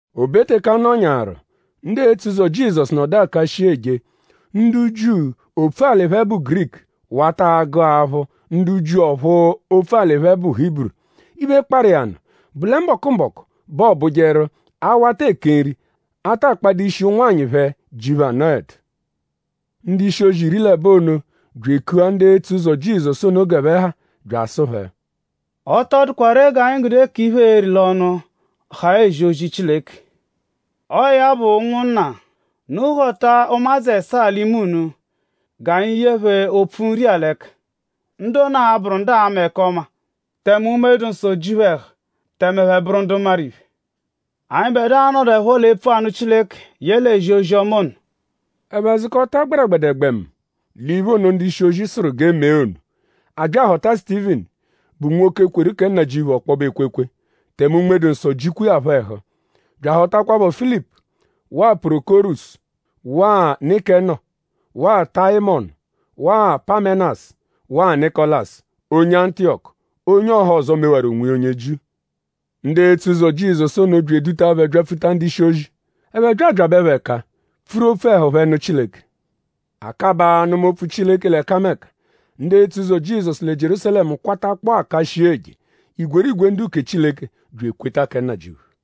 O be teke a nọnyaaru; ndu etso ụzo Jizọsu nọdu aka shii eje; ndu Jiu, opfu-alị phẹ bụ Giriku wata agụ aphụ ndu Jiu, ọphu opfu-alị phẹ bụ Hiburu. Iphe, kparụ iya nụ bụ lẹ mbọku-mbọku bẹ ọo bụjeru a -wata eke nri; a ta kpadụ ishi ụnwanyi phẹ, ji phẹ anọedu. Ndu-ishi-ozi iri l'ẹbo ono bya ekua ndu etso ụzo Jizọsu ono g'ẹphe ha bya asụ phẹ: “Ọ tọ dụkwa ree g'anyi gude k'iphe, eeri l'ọnu haa ezi ozi Chileke. Ọo ya bụ ụnwunna; unu họta ụmadzu ẹsaa l'ime unu; g'anyi ye phẹ opfu nri-a l'ẹka. Ndu ono a-bụru ndu aama ẹka ọma tẹme Unme-dụ-Nsọ ji phẹ ẹhu; tẹme ẹphe bụru ndu maru iphe. Anyịbedua a-nọduepho l'epfu anụ Chileke yẹle ezi ozi-ọma ono.” Ẹphe zụkota gbẹregbedegbemu l'iphe ono, ndu-ishi-ozi sụru g'e mee ono. A bya ahọta Sutivinu, bụ nwoke, kweru kẹ Nnajịuphu ọkpobe ekwekwe; tẹme Unme-dụ-Nsọ jikwa iya phọ ẹhu; bya ahọtakwapho Filipu waa Pọrokorosu waa Nikenọ waa Tayimọnu waa Pamẹnasu; waa Nịkolasu, onye Antiyọku, onye ọhozo, mewaru onwiya onye Jiu. Ndu etso ụzo Jizọsu ono bya eduta phẹ byapfuta ndu-ishi-ozi. Ẹphe bya abyabẹ phẹ ẹka; pfuru opfu ẹhu phẹ nụ Chileke. A kabaa anụma opfu Chileke l'ẹkameka. Ndu etso ụzo Jizọsu lẹ Jierúsalẹmu kwatakpọo aka shii eje. Igwerigwe ndu-uke Chileke bya ekweta kẹ Nnajịuphu.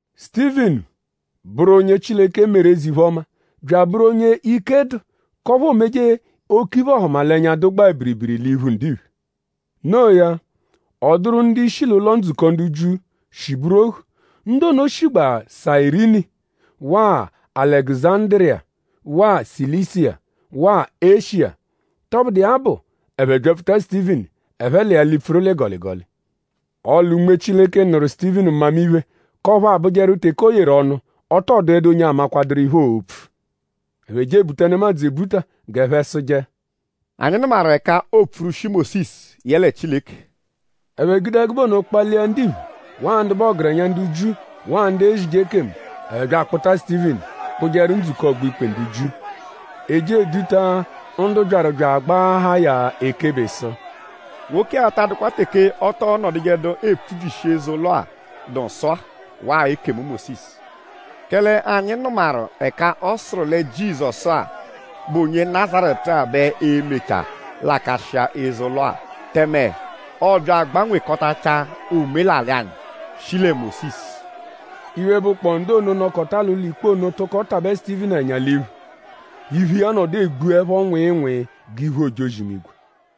Sutivinu bụru onye Chileke meru eze-iphe-ọma bya abụru onye ike dụ k'ọphu oomeje oke iphe-ọhumalenya, dụgbaa biribiri l'iphu ndiphe. Noo ya; ọ dụru ndu-ishi l'ụlo-ndzukọ ndu Jiu, shi bụru ohu. Ndu ono shigbaa Sayirini waa Alẹguzandiriya waa Silisiya waa Eshiya. Tọbudu iya bụ; ẹphe byapfuta Sutivinu ẹphe l'iya lipfuru l'ịgoligoli. Ọle Unme Chileke nụru Sutivinu mmamiphe k'ọphu abụjeru teke o yeru ọnu; ọ tọ dụedu onye amakwaduru iphe, oo-pfu. Ẹphe je ebuta nemadzụ ebuta g'ẹphe sụje: “Anyi nụmaru ẹka oopfurwushi Mósisu yẹle Chileke.” Ẹphe gude ẹgube ono kpalia ndiphe waa ndu bụ ọgerenya ndu Jiu waa ndu ezije ekemu. Ẹphe bya akpụta Sutivinu kpụjeru ndzukọ ọgbo-ikpe ndu Jiu. E je eduta ndu byaru bya agbaahaa ya ekebe sụ: “Nwoke-a ta adụkwa teke ọ tọo nọdujedu epfubyishi eze-ụlo-a, dụ nsọ-a waa ekemu Mósisu. Kẹle anyi nụmaru ẹka ọ sụru lẹ Jizọsu-a, bụ onye Nazaretu-a bẹ e-mechaa lakashịa eze-ụlo-a; tẹme ọobya agbanwekọtachaa omelalị anyi, shi lẹ Mósisu.” Iphe, bụkpoo ndu ono, nọkota l'ụlo-ikpe ono tụko tabẹ Sutivinu ẹnya l'iphu. Iphu iya nọdu egbuẹpho nwịinwii g'iphu ojozi-imigwe.